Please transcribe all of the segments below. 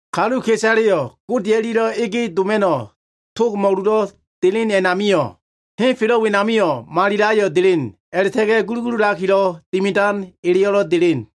Kaluka꞉isaleyo꞉ Gode o꞉lia꞉lo꞉ ege doma꞉no꞉ tog mo꞉luwo꞉ elen a꞉namio꞉, henfelo꞉ wenamio꞉ malilo꞉ ayo꞉ delen, a꞉la꞉ta꞉ga꞉ gulugululakilo꞉ dimidan eleyo꞉lo꞉ delen.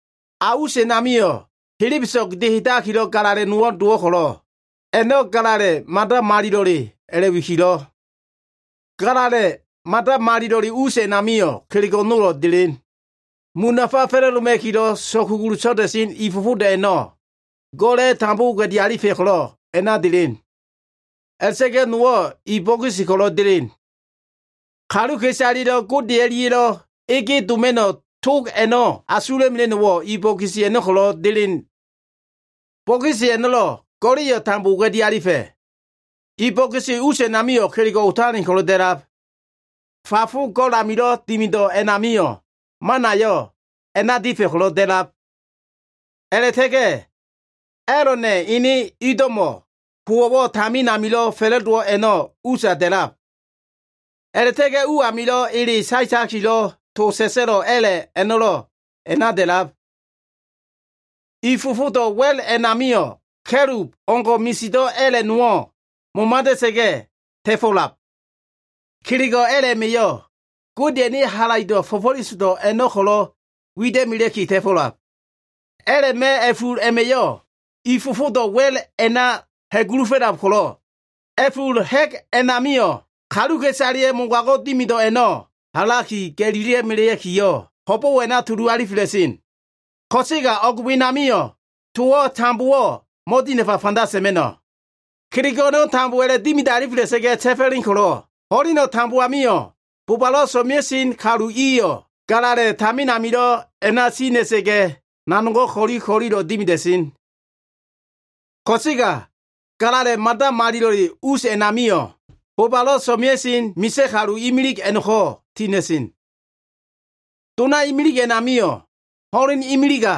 A us a꞉namio꞉ helebeso꞉go꞉ dehedakilo꞉ galala꞉ no꞉wo꞉ dowo꞉ ko꞉lo꞉, a꞉no꞉ Galala꞉ Mada Malilo꞉le a꞉la꞉wikilo꞉. Galala꞉ Mada Malilo꞉le us a꞉namio꞉ kelego꞉ nolo꞉ delen. Mun nafa fa꞉la꞉doma꞉kilo꞉ so꞉kugulu so꞉da꞉sen i fofodo꞉ a꞉no꞉, go꞉la꞉ tambo oga꞉di alifa꞉ ko꞉lo꞉ a꞉na delen. A꞉la꞉ta꞉ga꞉ nowo꞉ i bokisi ko꞉lo꞉ delen. Kaluka꞉isalelo꞉ Gode o꞉lia꞉lo꞉ ege doma꞉no꞉ tog a꞉no꞉ asula꞉mela꞉no꞉wo꞉ i bokisi a꞉no꞉ ko꞉lo꞉ delen. Bokisi a꞉no꞉lo꞉ go꞉la꞉yo꞉ tambo oga꞉di alifa꞉. I bokisi us a꞉namio꞉ kelego꞉ otalen ko꞉lo꞉ da꞉lab. Fafo go꞉l amilo꞉ dimido꞉ a꞉namio꞉ manayo꞉ a꞉na difa꞉ ko꞉lo꞉ da꞉lab. A꞉la꞉ta꞉ga꞉ A꞉lona꞉ ene ido꞉mo꞉ howo꞉wo꞉ tamin amilo꞉ fa꞉la꞉dowo꞉ a꞉no꞉lo꞉ usa da꞉lab. A꞉la꞉ta꞉ga꞉ u amilo꞉ ele saetakilo꞉ tolo꞉ sa꞉sa꞉lo꞉ a꞉la꞉ a꞉no꞉lo꞉ a꞉na da꞉lab. I fofodo꞉ wa꞉l a꞉namio꞉ ka꞉lub o꞉leo꞉ngo꞉ misido꞉ a꞉la꞉ nowo꞉ momadela꞉sa꞉ga꞉ ta꞉fo꞉lab. Kelego꞉ a꞉la꞉ a꞉ma꞉yo꞉ Godeya꞉ ene halaido꞉ fo꞉fo꞉lesodo꞉ a꞉no꞉ ko꞉lo꞉ wida꞉melea꞉ki ta꞉fo꞉lab. A꞉la꞉ma꞉ a꞉ful a꞉ma꞉yo꞉ i fofodo꞉ wa꞉l a꞉na ha꞉gulufo꞉lab ko꞉lo꞉, a꞉ful ha꞉g a꞉namio꞉ kaluka꞉isaleya꞉ mogago꞉ dimido꞉ a꞉no꞉ halaki ga꞉lila꞉melea꞉kiyo꞉, ho꞉bo꞉wo꞉ a꞉na tulu alifela꞉sen. Ko꞉sega o꞉g wenamio꞉ towo꞉ tambowo꞉ mo꞉dinafa fanda sa꞉ma꞉no꞉. Kelego꞉ a꞉no꞉ tambo a꞉la꞉dimidalifela꞉sa꞉ga꞉ ta꞉fo꞉len ko꞉lo꞉, ho꞉leno꞉ tambo amio꞉ bobalo꞉ so꞉mea꞉sen kalu iyo꞉ galala꞉ tamin amilo꞉ a꞉na tina꞉sa꞉ga꞉, nanogo꞉ ko꞉li ko꞉lilo꞉ dimida꞉sen. Ko꞉sega Galala꞉ Mada Malilo꞉le us a꞉namio꞉, bobalo꞉ so꞉mea꞉sen misa꞉ kalu imilig a꞉no꞉ko꞉ tina꞉sen. Dona imilig a꞉namio꞉ ho꞉leno꞉ imiliga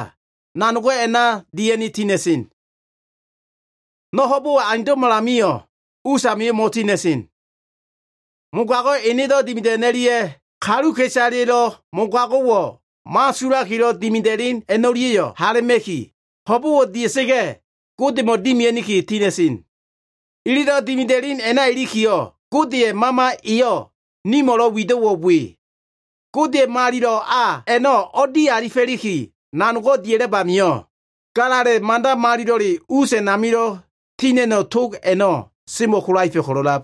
nanogo꞉ a꞉na dia꞉ni tina꞉sen. No꞉ ho꞉bo꞉wo꞉ aundo꞉malamio꞉, us amio꞉ mo꞉tina꞉sen. Mogago꞉ enedo꞉ dimido꞉ a꞉no꞉lia꞉ kaluka꞉isaleya꞉lo꞉ mogago꞉wo꞉ mo꞉asulakilo꞉ dimida꞉len a꞉no꞉lia꞉yo꞉ hala꞉ma꞉ki, ho꞉bo꞉wo꞉ dia꞉sa꞉ga꞉ Godemo꞉ dimia꞉ni tina꞉sen. Ililo꞉ dimida꞉len a꞉na ilikiyo꞉, Godeya꞉ Mama eyo꞉ nimo꞉lo꞉ wido꞉wo꞉ we. Godeya꞉ Malilo꞉ a a꞉no꞉ o꞉dialifo꞉liki nanogo꞉ dia꞉lab amio꞉, Galala꞉ Mada Malilo꞉le us amilo꞉ tina꞉no꞉ tog a꞉no꞉ semo꞉ kolaefa꞉ ko꞉lo꞉lab.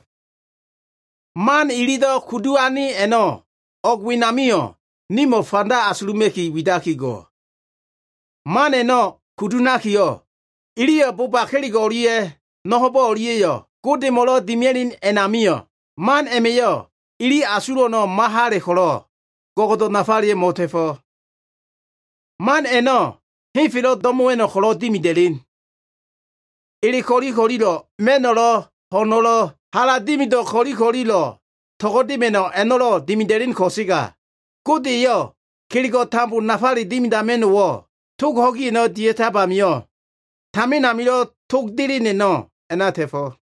Man ililo꞉ kudu ane a꞉no꞉ o꞉gdo꞉ wenamio꞉ nimo꞉ fanda asuluma꞉ki widaki go꞉. Man a꞉no꞉ kudu ha꞉nakiyo꞉, iliyo꞉ boba kelego꞉ o꞉lia꞉ no꞉ ho꞉bo꞉ o꞉lia꞉yo꞉ Godemo꞉lo꞉ dimia꞉len a꞉namio꞉, man a꞉ma꞉yo꞉ ili asulo꞉ a꞉no꞉ mo꞉hala꞉ ko꞉lo꞉, go꞉go꞉do꞉ nafaleyo꞉ mo꞉ta꞉fo꞉. Man a꞉no꞉ henfelo꞉ do꞉mo꞉wa꞉no꞉ ko꞉lo꞉ dimida꞉len. Ele ko꞉li ko꞉lilo꞉, ma꞉no꞉lo꞉, ho꞉no꞉lo꞉, hala dimido꞉ ko꞉li ko꞉lilo꞉ to꞉go꞉dema꞉no꞉ a꞉no꞉lo꞉ dimida꞉len ko꞉sega, Gode eyo꞉ kelego꞉ tambo nafale dimidama꞉no꞉wo꞉ tog ho꞉gi a꞉no꞉ dia꞉tab amio꞉, tamin amilo꞉ tog delen a꞉no꞉ a꞉na ta꞉fo꞉.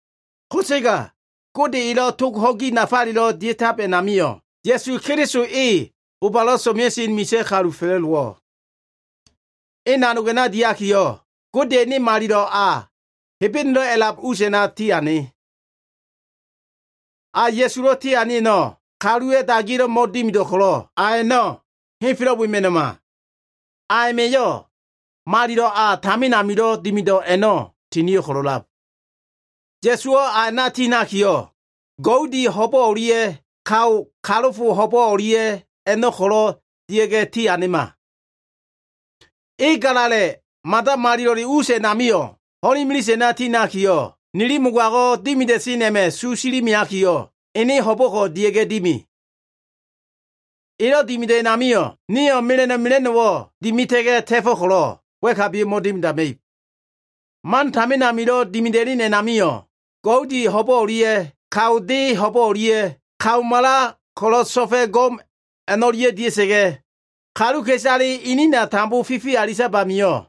Ko꞉sega Gode elo꞉ tog ho꞉gi nafalelo꞉ dia꞉tab a꞉namio꞉, Ya꞉su Keliso e, bobalo꞉ so꞉mea꞉sen misa꞉ kalu fa꞉la꞉dowo꞉. E nanog a꞉no꞉ diakiyo꞉, Godeya꞉ ene Malilo꞉ a, Hebenelo꞉ a꞉lab us a꞉na tiane. A Ya꞉sulo꞉ tiane a꞉no꞉ kaluwa꞉ dagiya꞉lo꞉ mo꞉dimido꞉ ko꞉lo꞉, a a꞉no꞉ henfelo꞉ wema꞉no꞉ma. A a꞉ma꞉yo꞉ Malilo꞉ a tamin amilo꞉ dimido꞉ a꞉no꞉ tinio꞉ ko꞉lo꞉lab. Ya꞉suwo꞉ a a꞉na tiha꞉nakiyo꞉, goudi ho꞉bo꞉ o꞉lia꞉ kao kalofo ho꞉bo꞉ o꞉lia꞉ a꞉no꞉ ko꞉lo꞉ dia꞉ga꞉ tianema. E Galala꞉ Mada Malilo꞉le us a꞉namio꞉ ho꞉len imilise a꞉na tinakiyo꞉, nili mogago꞉ dimida꞉sen a꞉ma꞉ su silimeakiyo꞉, ene ho꞉bo꞉ko꞉ dia꞉ga꞉ dimi. Elo꞉ dimido꞉ a꞉namio꞉, nio꞉ mela꞉no꞉ mela꞉no꞉wo꞉ dimita꞉ga꞉ ta꞉fo꞉ ko꞉lo꞉, wa꞉kabiyo꞉ mo꞉dimidama꞉ib. Man tamin amilo꞉ dimida꞉len a꞉namio꞉, goudi ho꞉bo꞉ o꞉lia꞉ kao de ho꞉bo꞉ o꞉lia꞉, kao mala ko꞉lo꞉ so꞉fa꞉ go꞉m a꞉no꞉lia꞉ dia꞉sa꞉ga꞉, kaluka꞉isale inina tambo fifi alitab amio꞉,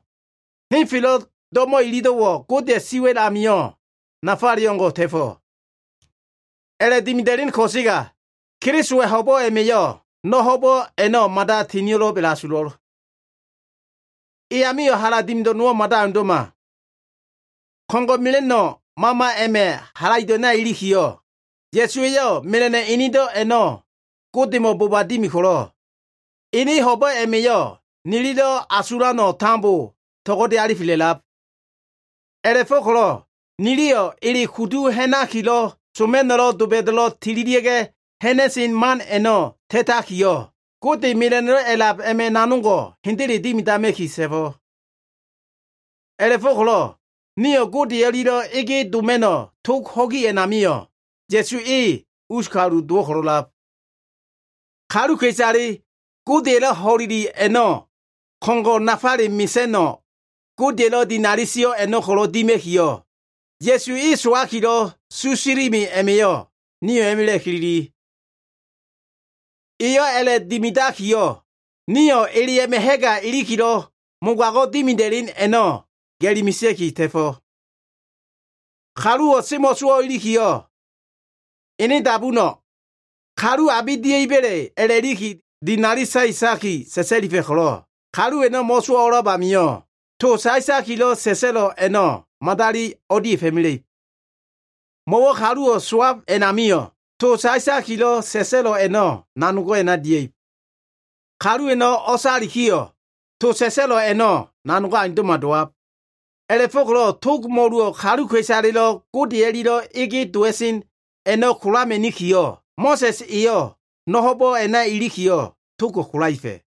henfelo꞉ do꞉mo꞉ ililo꞉wo꞉ Godeya꞉ si wa꞉l amio꞉ nafaleyo꞉ o꞉ngo꞉ ta꞉fo꞉. A꞉la꞉dimida꞉len ko꞉sega Kelisowa꞉ ho꞉bo꞉ a꞉ma꞉yo꞉ no꞉ ho꞉bo꞉ a꞉no꞉ mada tinio꞉lo꞉b a꞉la꞉asulo꞉l. E amio꞉ hala dimido꞉ nowo꞉ mada aundo꞉ma. Ko꞉ngo꞉ mela꞉no꞉ Mama a꞉ma꞉ halaido꞉ a꞉na ilikiyo꞉, Ya꞉su eyo꞉ mela꞉no꞉ enedo꞉ a꞉no꞉ Godemo꞉ boba dimi ko꞉lo꞉, ene ho꞉bo꞉ a꞉ma꞉yo꞉ nilido꞉ asulano꞉ tambo to꞉go꞉de alifela꞉lab. A꞉la꞉fo꞉ko꞉lo꞉ niliyo꞉ ele kudu ha꞉nakilo꞉ soma꞉no꞉lo꞉ doba꞉da꞉lo꞉ tililia꞉ga꞉ ha꞉na꞉sen man a꞉no꞉ ta꞉takiyo꞉, Gode mela꞉no꞉ a꞉lab a꞉ma꞉ nanogo꞉ hendele dimidama꞉ki ta꞉fo꞉. A꞉la꞉fo꞉ko꞉lo꞉ nio꞉ Gode o꞉lia꞉lo꞉ ege doma꞉no꞉ tog ho꞉gi a꞉namio꞉, Ya꞉su e, us kalu dowo꞉ ko꞉lo꞉lab. Kaluka꞉isale Godeya꞉lo꞉ ho꞉leli a꞉no꞉ ko꞉ngo꞉ nafale mesa꞉no꞉, Godeya꞉lo꞉ dinali sio꞉ a꞉no꞉ ko꞉lo꞉ dima꞉kiyo꞉, Ya꞉su e sowakilo꞉ su silime a꞉ma꞉yo꞉ nio꞉ a꞉ma꞉la꞉ kilili. Eyo꞉ a꞉la꞉dimidakiyo꞉, nio꞉ ele a꞉ma꞉ ha꞉ga ilikilo꞉ mogago꞉ dimida꞉len a꞉no꞉ ga꞉li mesea꞉ki ta꞉fo꞉. Kaluwo꞉ semo꞉sowo꞉ ilikiyo꞉, ene dabuno꞉, kalu abe dia꞉iba꞉le a꞉la꞉liki dinali saetaki sa꞉sa꞉lifa꞉ ko꞉lo꞉, kalu a꞉no꞉ mo꞉sowo꞉ o꞉a꞉lab amio꞉, to saetakilo꞉ sa꞉sa꞉lo꞉ a꞉no꞉ madali o꞉dia꞉fo꞉mela꞉ib. Mo꞉wo꞉ kaluwo꞉ sowab a꞉namio꞉, to saetakilo꞉ sa꞉sa꞉lo꞉ a꞉no꞉ nanogo꞉ a꞉na dia꞉ib. Kalu a꞉no꞉ o꞉salikiyo꞉, to sa꞉sa꞉lo꞉ a꞉no꞉ nanogo꞉ aundo꞉ma dowab. A꞉la꞉fo꞉ko꞉lo꞉ tog mo꞉luwo꞉ kaluka꞉isalelo꞉ Gode o꞉lia꞉lo꞉ ege dowa꞉sen a꞉no꞉ kolama꞉nikiyo꞉, Mo꞉sa꞉s eyo꞉ no꞉ ho꞉bo꞉ a꞉na ilikiyo꞉, togo꞉ kolaefa꞉.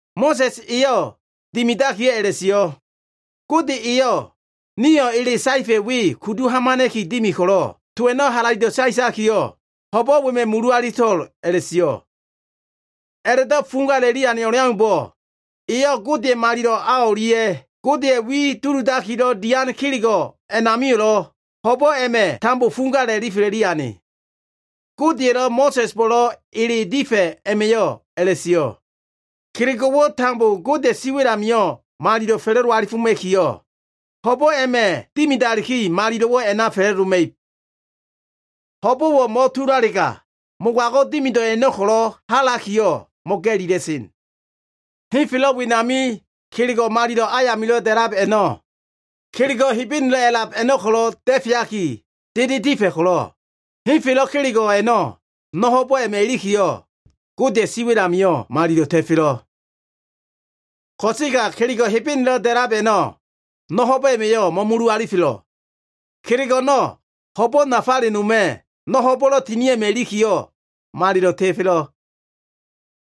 Mo꞉sa꞉s eyo꞉ dimidakiyo꞉ a꞉la꞉sio꞉, “Gode eyo꞉ nio꞉ ele saefa꞉ we kudu hamana꞉ki dimi ko꞉lo꞉, to a꞉no꞉ halaido꞉ saetakiyo꞉, ho꞉bo꞉ wema꞉ mulu alito꞉l” a꞉la꞉sio꞉. A꞉la꞉do꞉ fuga a꞉la꞉li ane o꞉leaumbo꞉, eyo꞉ Godeya꞉ malilo꞉ a o꞉lia꞉, Godeya꞉ wi duludakilo꞉ dian kelego꞉ a꞉namio꞉lo꞉ ho꞉bo꞉ a꞉ma꞉ tambo fuga alifela꞉li ane. Godeya꞉lo꞉ Mo꞉sa꞉sbo꞉lo꞉ ele difa꞉ a꞉ma꞉yo꞉ a꞉la꞉sio꞉, “Kelego꞉wo꞉ tambo Godeya꞉ siwa꞉l amio꞉ malilo꞉ fa꞉la꞉do alifoma꞉kiyo꞉, ho꞉bo꞉ a꞉ma꞉ dimidaliki, malilo꞉wo꞉ a꞉na fa꞉la꞉doma꞉ib.” Ho꞉bo꞉wo꞉ mo꞉tulalega, mogago꞉ dimido꞉ a꞉no꞉ ko꞉lo꞉ halakiyo꞉ mo꞉ga꞉lila꞉sen. Henfelo꞉ wenami kelego꞉ malilo꞉ ayamilo꞉ da꞉lab a꞉no꞉, kelego꞉ Hebenelo꞉ a꞉lab a꞉no꞉ ko꞉lo꞉ da꞉feaki dede difa꞉ ko꞉lo꞉, henfelo꞉ kelego꞉ a꞉no꞉ no꞉ ho꞉bo꞉ a꞉ma꞉ ilikiyo꞉, Godeya꞉ siwa꞉l amio꞉ malilo꞉ ta꞉felo꞉. Ko꞉sega kelego꞉ Hebenelo꞉ da꞉lab a꞉no꞉ no꞉ ho꞉bo꞉ a꞉ma꞉yo꞉ mo꞉mulu alifelo꞉. Kelego꞉ a꞉no꞉, ho꞉bo꞉ nafale noma꞉, no꞉ ho꞉bo꞉lo꞉ tinio꞉ a꞉ma꞉ ilikiyo꞉ malilo꞉ ta꞉felo꞉.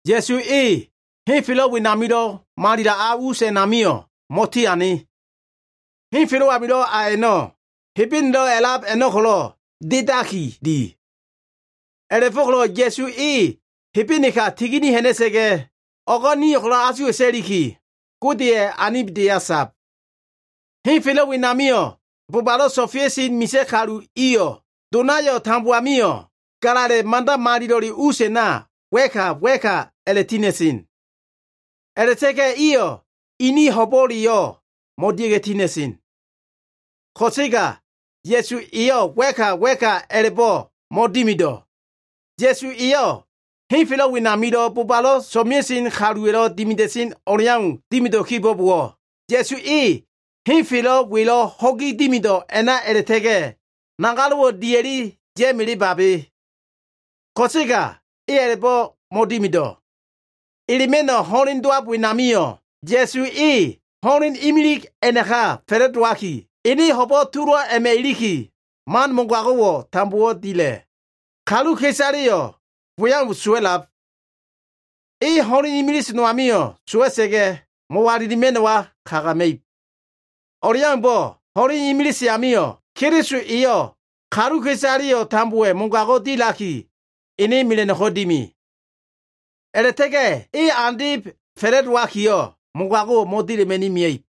Ya꞉su e, henfelo꞉ wenamilo꞉ Malilo꞉ a us a꞉namio꞉ mo꞉tiane. Henfelo꞉ amilo꞉ a a꞉no꞉, Hebenelo꞉ a꞉lab a꞉no꞉ ko꞉lo꞉ dedaki di. A꞉la꞉fo꞉ko꞉lo꞉ Ya꞉su e Hebeneka tigini ha꞉na꞉sa꞉ga꞉, o꞉go꞉ nio꞉ ko꞉lo꞉ asuwa꞉ta꞉liki, Godeya꞉ anibdeya sab. Henfelo꞉ wenamio꞉ bobalo꞉ so꞉mea꞉sen misa꞉ kalu iyo꞉ donayo꞉ tambo amio꞉ Galala꞉ Mada Malilo꞉le us a꞉na wa꞉ka wa꞉ka a꞉la꞉tina꞉sen. A꞉la꞉ta꞉ga꞉ iyo꞉ ini ho꞉bo꞉leyo꞉ mo꞉dia꞉ga꞉ tina꞉sen. Ko꞉sega Ya꞉su eyo꞉ wa꞉ka wa꞉ka a꞉la꞉bo꞉ mo꞉dimido꞉. Ya꞉su eyo꞉ henfelo꞉ wenamilo꞉ bobalo꞉ so꞉mea꞉sen kaluwa꞉lo꞉ dimida꞉sen o꞉leau dimido꞉ kibo꞉bowo꞉, Ya꞉su e henfelo꞉ welo꞉ ho꞉gi dimido꞉ a꞉na a꞉la꞉ta꞉ga꞉, nagalo꞉wo꞉ dia꞉li ya꞉melebabe. Ko꞉sega e a꞉la꞉do꞉ mo꞉dimido꞉. Elema꞉no꞉ ho꞉len dowab wenamio꞉, Ya꞉su e ho꞉len imilig a꞉naka fa꞉la꞉dowaki, ene ho꞉bo꞉ tulo꞉ a꞉ma꞉ iliki, man mogago꞉wo꞉ tambo dila꞉. Kaluka꞉isaleyo꞉ we au sowa꞉lab. E ho꞉len imilise noamio꞉ sowa꞉sa꞉ga꞉, mo꞉walilima꞉no꞉wa kagama꞉ib. O꞉leaumbo꞉ ho꞉len imilise amio꞉, Keliso eyo꞉ kaluka꞉isale tambowa꞉ mogago꞉ dilaki, ene do꞉mo꞉ko꞉ dimi. A꞉la꞉ta꞉ga꞉ e andeb fa꞉la꞉dowakiyo꞉, mogago꞉wo꞉ mo꞉dila꞉ma꞉ni mia꞉ib.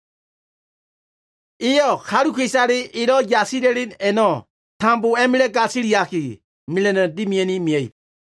Eyo꞉ kaluka꞉isale elo꞉ yasila꞉len a꞉no꞉ tambo a꞉ma꞉la꞉ gasiliaki, mela꞉no꞉ dimia꞉ni mia꞉ib.